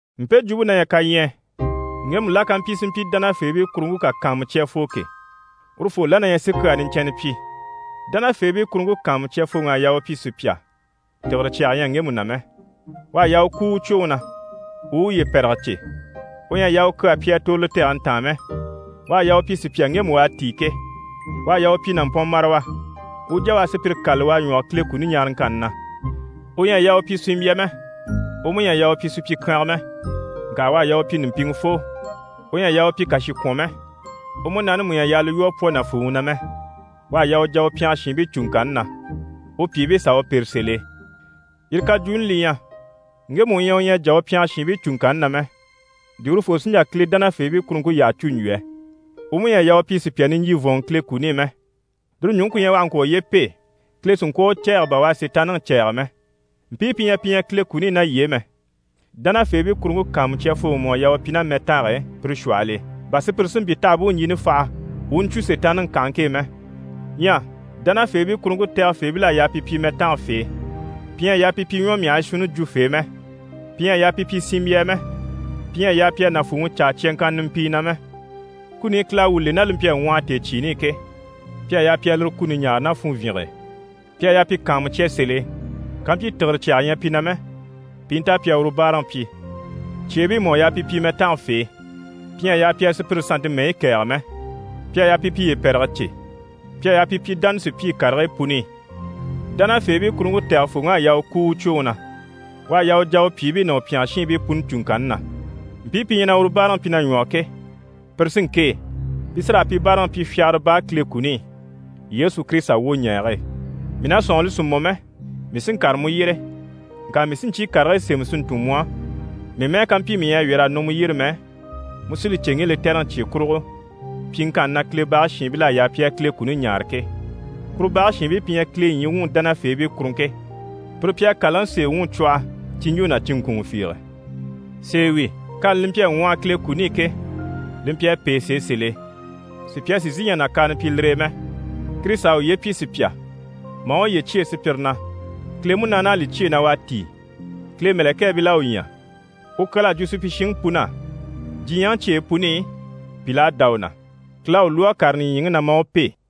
Mpe jwumpe na ɲyɛ kaɲyɛɛ: ŋgemu la ká mpyi si mpyi dánafeebii kuruŋke kà kàanmucyafoo ke, urufoo la na ɲyɛ si kyaa niɲcɛnnɛ pyi. Dánafeebii kuruŋke kàanmucyafooŋ'à yaa u pyi sùpya, tìgire cyaga ɲyɛ ŋgemu na mɛ, u à yaa u kúu u cwoŋi na, u u uye pɛ̀rɛge cè, u ɲyɛ a yaa u kyaa pyi a tòro li tɛgɛni taan mɛ, u à yaa u pyi sùpya ŋgemu u à tíi ke, u à yaa u pyi nàmpɔnmarawa, u u jà u a sùpyire kâlali u a ɲwɔge Kile kuni ɲaaraŋkanni na. U ɲyɛ a yaa u pyi sinmbya mɛ, u mú ɲyɛ a yaa u pyi supyikyanga mɛ, ŋka u à yaa u pyi ɲùmpiŋɛfoo. U ɲyɛ a yaa u pyi kàshikwɔn mɛ, u múnaani mú ɲyɛ a yaa li lwɔ́ a pwɔ nàfuuŋi na mɛ. U à yaa u jà u pyɛngɛ shiinbii cùŋkanni na, u pyìibii s'a u pêre sèl'e. Yire kajwuuni li ɲyɛ, ŋgemu u ɲyɛ u ɲyɛ a jà u pyɛngɛ shiinbii cùŋkanni na mɛ, di urufoo sí n‑jà Kile dánafeebii kuruŋke yyaha cû n‑jwo yɛ? U mú ɲyɛ a yaa u pyi sùpya niɲjyivɔnŋɔ Kile kuni i mɛ, lire ɲùŋke ku ɲyɛ u àha ŋkwɔ̀ uye pêe, Kile si ŋkwɔ̀ a u cɛ̂ɛgɛ bà u à Sitaanniŋi cɛ̂ɛgɛ mɛ. Mpii pi ɲyɛ pi ɲyɛ Kile kuni i ná yii e mɛ, dánafeebii kuruŋke kàanmucyafooŋi mú à yaa u pyi ná mɛtange e pire shwɔhɔl'e, bà sùpyire si mpyi t'àha bú u ɲjini faha, u u ɲcwo Sitaanniŋi kànhaŋke e mɛ. Ɲyɛ dánafeebii kuruŋke tɛgɛfeebil'à yaa pi pyi mɛtangafee, pi ɲyɛ a yaa pi pyi ɲwɔmyahigii shuunni jwufee mɛ, pi ɲyɛ a yaa pi pyi sinmbyaa mɛ, pi ɲyɛ a yaa pi a nàfuuŋi caa cyaŋkanna nimpii na mɛ. Kuni i Kile à wuu le, ná li mpyi a ŋwɔhɔ tèecyiini i ke, pi à yaa pi a lire kuni ɲaare ná funvyinge e. Pi à yaa pi kàanmucya sèl'e kampyi tìgire cyaga ɲyɛ pi na mɛ, pi i nta pi a uru báaraŋi pyi. Cyeebii mú à yaa pi pyi mɛtangafee, pi ɲyɛ a yaa pi a sùpyire sannte mɛyi kɛ̀ɛge mɛ, pi à yaa pi piye pɛ̀rɛge cè, pi à yaa pi pyi dánasupyii karigii puni i. Dánafeebii kuruŋke tɛgɛfooŋ'à yaa u kúu u cwoŋi na, u à yaa u jà u pyìibii ná u pyɛngɛ shiinbii puni cùŋkanni na. Mpii pi ɲyɛ na uru báaraŋi pyi na ɲwɔge ke, pire sí n‑kêe. Pi sí raa pi báaraŋi pyi fyagara baa Kile kuni i, Yesu Kirisita wwoɲɛɛge e. Mii na sɔ̂nŋi, li sì mɔ mɛ, mii sí n‑kàre mu yyére, ŋka mii sí ɲcyii karigii sémɛ si ntun mu á. Mii mɛ́ɛ ká mpyi mii ɲyɛ a wyɛ̀r'a nɔ mu yyére mɛ, mu sí li cè ŋge lɛtɛrɛŋi cye kurugo, pyiŋkanni na Kile bage shiinbil'à yaa pi a Kile kuni ɲaare ke. Kuru bage shiinbii pi ɲyɛ Kile ɲyii wuŋi dánafeebii kuruŋke, pire pi à kàlaŋi sèe wuŋi cwɔhɔ cinɲjo ná cinŋkunŋɔ fiige. Sèe wi, kani li mpyi a ŋwɔhɔ Kile kuni i ke, li mpyi a pêe sèe sèl'e, sùpya sì n‑sìi n‑jà nàkaana pyi lire e mɛ: Kirisita à uye pyi sùpya, maa uye cyêe sùpyire na, Kile Munaani à li cyêe na u à tíi, Kile mɛ̀lɛkɛɛbil'à u ɲya. U kyal'à jwo supyishiŋi pun'á, Diɲyɛŋi cyeyi puni i, pìl'à dá u na, Kile à u lwɔ́ a kàre nìɲyiŋi na maa u pêe.